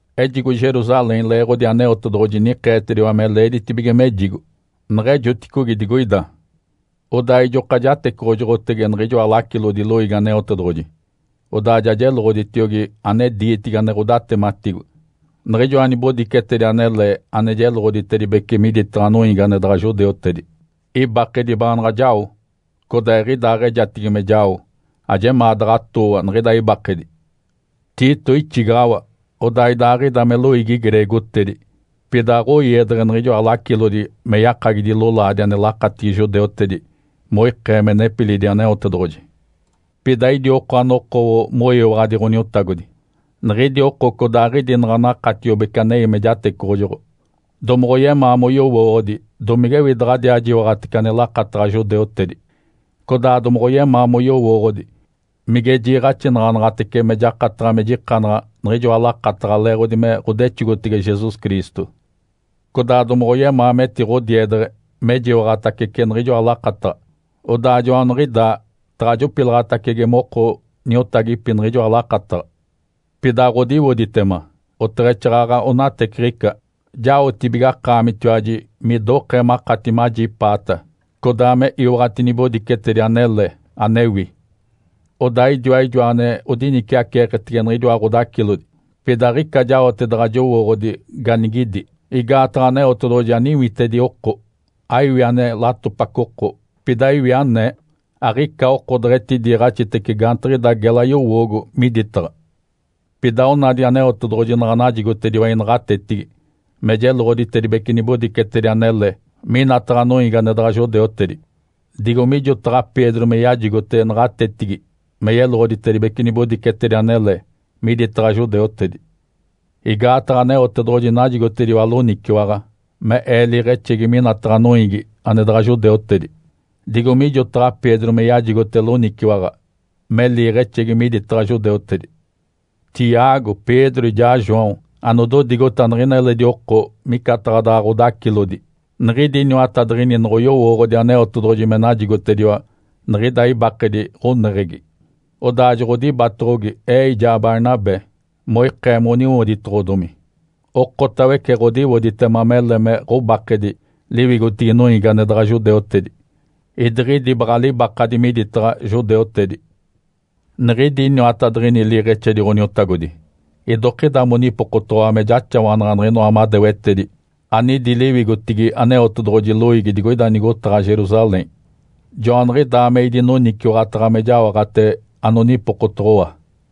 Ejigo Jerusalém leeɡ̶odi Aneotedoɡ̶oji nikeetediwa me leeditibige mejigo. Neɡ̶ejoticogi digoida, odaa ijoka jatecoɡ̶ojoɡ̶otege niɡ̶ijoa lacilodi loiigi Aneotedoɡ̶oji. Odaa ja jeloɡ̶oditiogi ane diitigi ane ɡ̶odatematigo, niɡ̶ijoa nibodicetedi anele ane jeloɡ̶oditedibece miditaɡ̶a noiigi ane daɡ̶a judeutedi. Ibakedi baanaɡ̶a jao codaa eɡ̶idaaɡ̶ejatigi me jao, ajemaa daɡ̶a atooa niɡ̶ida ibakedi. Tito ixigaɡ̶awa. Odaa idaaɡ̶ida me loiigi greegotedi, pida aɡ̶oiedeɡ̶e niɡ̶ijoa lacilodi me yakagidi lolaadi ane lakatigi judeutedi moikee me nepilidi Aneotedoɡ̶oji. Pida idi oko anokowo moyiwaɡ̶adi Ǥoniotagodi. Niɡ̶idi oko codaaɡ̶idi naɡ̶a dakatiobece anei me jatecoɡ̶ojoɡ̶o, domoɡ̶oyemaa moyowooɡ̶odi domigewi daɡ̶adiaa jiwaɡ̶atece ane lakataɡ̶a judeutedi, codaa domoɡ̶oyemaa moyowooɡ̶odi mige jiiɡ̶axinaɡ̶anaɡ̶atece me jakataɡ̶a me jikanaɡ̶a niɡ̶ijoa lakataɡ̶a leeɡ̶odi me ɡ̶odexogotege Jesus Cristo. Codaa domoɡ̶oyemaa metiɡ̶odiedeɡ̶e mejiwaɡ̶atacece niɡ̶ijoa lakataɡ̶a, odaa joaniɡ̶idaa taɡ̶a jopilaɡ̶atacege moko niotagipi niɡ̶ijoa lakataɡ̶a. Pida aɡ̶odiwoditema, oteɡ̶exaaɡ̶aɡ̶a onateciɡ̶ica, jaotibige akaamitiwaji midokee makati majipaata, codaa me iwaɡ̶ati nibodicetedi anele anewi. Odaa idiwa ijoa ane odiniciaceeketege niɡ̶idiwa ɡ̶odacilodi, pida aɡ̶ica jaote daɡ̶a jowooɡ̶odi ganigidi, igaataɡ̶a Aneotedoɡ̶oji aniwitedi oko aiwi ane latopaco oko, pida iwi anee. Aɡ̶ica oko deɡ̶etidiiɡ̶axitece gaantiɡ̶ida gela yowoogo miditaɡ̶a. Pida onadi Aneotedoɡ̶oji naɡ̶a najigotediwa inaɡ̶atetigi me jeloɡ̶oditedibece nibodicetedi anele minataɡ̶a noiigi ane daɡ̶a judeutedi, digo mijotaɡ̶a Pedro me yajigote naɡ̶atetigi me yeloɡ̶oditedibece nibodicetedi anele miditaɡ̶a judeutedi. Igaataɡ̶a Aneotedoɡ̶oji najigotediwa loniciwaɡ̶a me ee liiɡ̶exegi minataɡ̶a noiigi ane daɡ̶a judeutedi, digo mijotaɡ̶a Pedro me yajigote loniciwaɡ̶a me liiɡ̶exegi miditaɡ̶a judeutedi. Tiago, Pedro ijaa João, anododigota niɡ̶ina eledi oko micataɡ̶a daɡ̶a ɡ̶odacilodi, niɡ̶idi iniwatadiɡ̶ini noɡ̶oyowooɡ̶odi Aneotedoɡ̶oji me najigotediwa niɡ̶ida ibakedi ɡ̶oneɡ̶egi, odaa joɡ̶odibatoɡ̶ogi ee ijaa Barnabé moikee moniwoditoɡ̶odomi. Okotawece ɡ̶odiwoditema mele me ɡ̶obakadi liwigotigi noiigi ane daɡ̶a judeutedi, idiɡ̶idi baɡ̶a libakadi miditaɡ̶a judeutedi. Niɡ̶idi iniwatadiɡ̶ini liiɡ̶exedi Ǥoniotagodi idokida monipokotoɡ̶owa me jaxawanaɡ̶a niɡ̶inoa madewetedi anidi liwigotigi Aneotedoɡ̶oji loiigi digoida nigotaɡ̶a Jerusalém. Joaniɡ̶idaa me idinoniciwaɡ̶ataɡ̶a me jaoɡ̶ate anonipokotoɡ̶owa.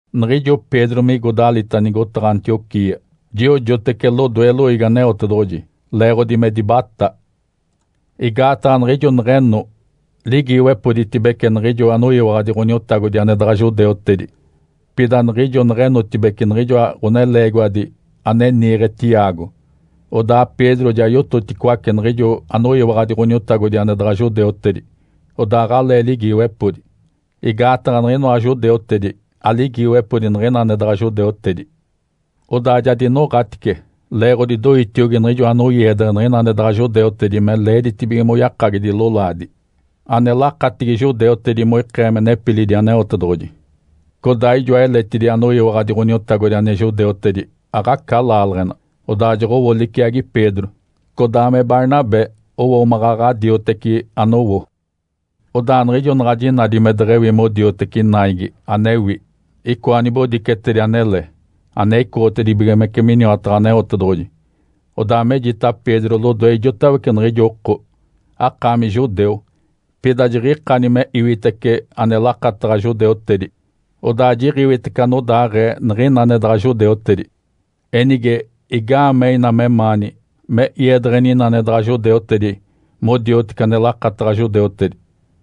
Niɡ̶ijo Pedro migo dalita nigotaɡ̶a Antioquia, jiojotece lodoe loiigi Aneotedoɡ̶oji, leeɡ̶odi me dibatá. Igaataɡ̶a niɡ̶ijo neɡ̶eno, ligiiwepoditibece niɡ̶ijo anoyiwaɡ̶adi Ǥoniotagodi ane daɡ̶a judeutedi. Pida niɡ̶ijo neɡ̶enotibeci niɡ̶ijoa ɡ̶oneleegiwadi ane niiɡ̶e Tiago, odaa Pedro ja yototicoace niɡ̶ijo anoyiwaɡ̶adi Ǥoniotagodi ane daɡ̶a judeutedi, odaa aɡ̶alee ligiiwepodi, igaataɡ̶a niɡ̶inoa judeutedi aliigiwepodi niɡ̶ina ane daɡ̶a judeutedi. Odaa ja dinoɡ̶atice leeɡ̶odi doitiogi niɡ̶ijo anoiedeɡ̶e niɡ̶ina ane daɡ̶a judeutedi me leeditibige moyakagidi lolaadi, ane lakatigi judeutedi, moikee me nepilidi Aneotedoɡ̶oji. Codaa ijoa eletidi anoyiwaɡ̶adi Ǥoniotagodi ane judeutedi aɡ̶aca laaleɡ̶ena, odaa joɡ̶owo liciagi Pedro. Codaa me Barnabé owo maɡ̶aɡ̶a dioteci anowo. Odaa niɡ̶ijo naɡ̶a jinadi me deɡ̶ewi modioteci naigi anewi icoa nibodicetedi anele, ane icoɡ̶otibigimece miniwataɡ̶a Aneotedoɡ̶oji, odaa mejita Pedro lodoe ijotawece niɡ̶ijo oko, “Akaami judeu, pida jiɡ̶ikani me iwitece ane lakataɡ̶a judeutedi, odaa jiɡ̶iwitece anodaaɡ̶ee niɡ̶ina ane daɡ̶a judeutedi. Enige, igaamee ina memaani me iedeɡ̶eni ina ane daɡ̶a judeutedi modioteci ane lakataɡ̶a judeutedi?”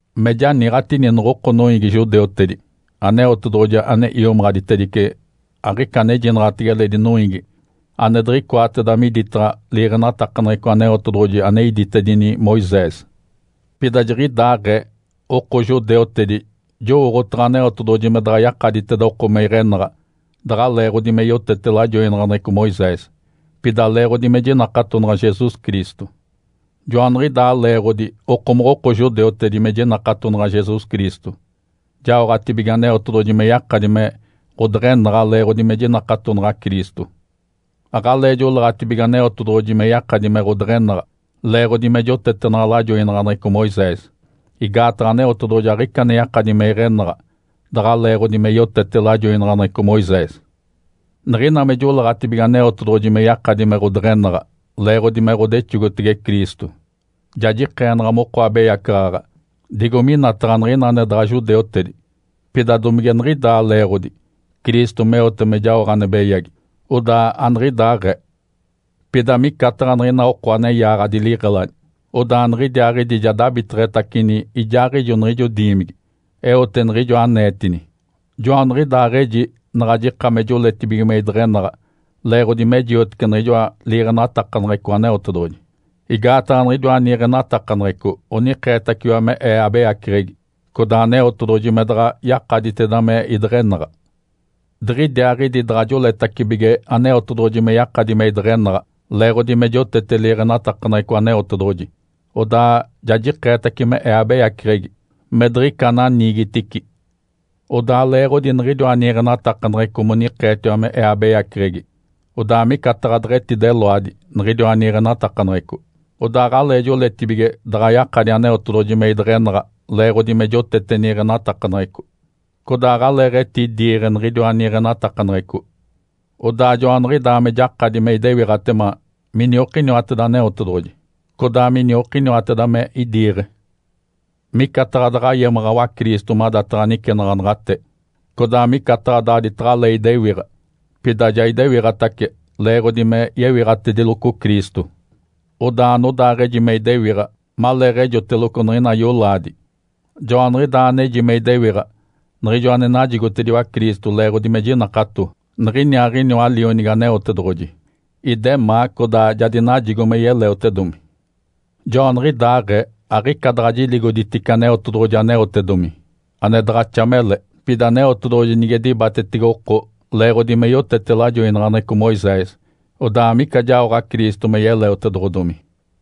Me janiiɡ̶atini noɡ̶oko noiigi judeutedi, Aneotedoɡ̶oji ane iomaɡ̶aditedice, aɡ̶ica anejinaɡ̶atege eledi noiigi ane diɡ̶icoateda miditaɡ̶a liiɡ̶enatakaneɡ̶eco Aneotedoɡ̶oji ane iditedini Moisés. Pida jiɡ̶idaaɡ̶ee oko judeutedi, jowooɡ̶otaɡ̶a Aneotedoɡ̶oji me daɡ̶a yakaditeda oko me iɡ̶enaɡ̶a daɡ̶a leeɡ̶odi me yotete lajoinaɡ̶aneɡ̶eco Moisés, pida leeɡ̶odi me jinakatonaɡ̶a Jesus Cristo. Joaniɡ̶idaa leeɡ̶odi okomoɡ̶oko judeutedi me jinakatonaɡ̶a Jesus Cristo, jaoɡ̶atibige Aneotedoɡ̶oji me yakadi me ɡ̶odeɡ̶enaɡ̶a leeɡ̶odi me jinakatonaɡ̶a Cristo. Aɡ̶alee joleeɡ̶atibige Aneotedoɡ̶oji me yakadi me ɡ̶odeɡ̶enaɡ̶a, leeɡ̶odi me jotetenaɡ̶a lajoinaɡ̶aneɡ̶eco Moisés. Igaataɡ̶a Aneotedoɡ̶oji aɡ̶ica ane yakadi me iɡ̶enaɡ̶a daɡ̶a leeɡ̶odi me yotete lajoinaɡ̶aneɡ̶eco Moisés. Niɡ̶ina me joleeɡ̶atibige Aneotedoɡ̶oji me yakadi me ɡ̶odeɡ̶enaɡ̶a leeɡ̶odi me ɡ̶odexogotege Cristo, ja jikeenaɡ̶a moko abeyacaɡ̶aɡ̶a digo minataɡ̶a niɡ̶ina ane daɡ̶a judeutedi. Pida domige niɡ̶idaa leeɡ̶odi, Cristo meote me jaoɡ̶a ane beyagi? Odaa aniɡ̶idaaɡ̶ee! Pida micataɡ̶a niɡ̶ina oko ane yaaɡ̶adi liɡ̶eladi, odaa niɡ̶idiaaɡ̶idi ja dabiteɡ̶etacini ijaaɡ̶ijo niɡ̶ijo diimigi. Eote niɡ̶ijo aneetini. Joaniɡ̶idaaɡ̶eji naɡ̶a jika me joletibige me ideɡ̶enaɡ̶a leeɡ̶odi me jiotece niɡ̶ijoa liiɡ̶enatakaneɡ̶eco Aneotedoɡ̶oji, igaataɡ̶a niɡ̶idiwa niiɡ̶enatakaneɡ̶eco onikeetaciwa me ee abeyaceɡ̶egi, codaa Aneotedoɡ̶oji me daɡ̶a yakaditeda me ideɡ̶enaɡ̶a. Diɡ̶idiaaɡ̶idi daɡ̶a joletacibige Aneotedoɡ̶oji me yakadi me ideɡ̶enaɡ̶a leeɡ̶odi me jotete liiɡ̶enatakaneɡ̶eco Aneotedoɡ̶oji, odaa ja jikeetace me ee abeyaceɡ̶egi, me diɡ̶ica ananiigitici. Odaa leeɡ̶odi niɡ̶idiwa niiɡ̶enatakaneɡ̶eco monikeetiwa me ee abeyaceɡ̶egi, odaa micataɡ̶a deɡ̶etideloadi niɡ̶idiwa niiɡ̶enatakaneɡ̶eco. Odaa aɡ̶alee joletibige daɡ̶a yakadi Aneotedoɡ̶oji me ideɡ̶enaɡ̶a leeɡ̶odi me jotete niiɡ̶enatakaneɡ̶eco, codaa aɡ̶aleeɡ̶etidiiɡ̶e niɡ̶idiwa niiɡ̶enatakaneɡ̶eco. Odaa joaniɡ̶idaa me jakadi me idewiɡ̶atema miniokiniwateda Aneotedoɡ̶oji, codaa miniokiniwateda me idiiɡ̶e. Micataɡ̶a daɡ̶a yemaɡ̶awa Cristo madataɡ̶a nicenaɡ̶anaɡ̶ate, codaa micataɡ̶a daaditaɡ̶alee idewiɡ̶a. Pida ja idewiɡ̶atace leeɡ̶odi me yewiɡ̶atediloco Cristo. Odaa anodaaɡ̶eji me idewiɡ̶a maleeɡ̶ejoteloco niɡ̶ina yolaadi, joaniɡ̶idaa aneji me idewiɡ̶a niɡ̶ijo ane najigotediwa Cristo leeɡ̶odi me jinakato Niɡ̶iniaaɡ̶iniwa, Lionigi Aneotedoɡ̶oji. Idemaa codaa ja dinajigo me yeleotedomi. Joaniɡ̶idaaɡ̶ee aɡ̶ica daɡ̶a jiligoditice Aneotedoɡ̶oji aneotedomi, ane daɡ̶axa mele. Pida Aneotedoɡ̶oji nige dibatetege oko leeɡ̶odi me yotete lajoinaɡ̶aneɡ̶eco Moisés, odaa amica jaoɡ̶a Cristo me yeleotedoɡ̶odomi.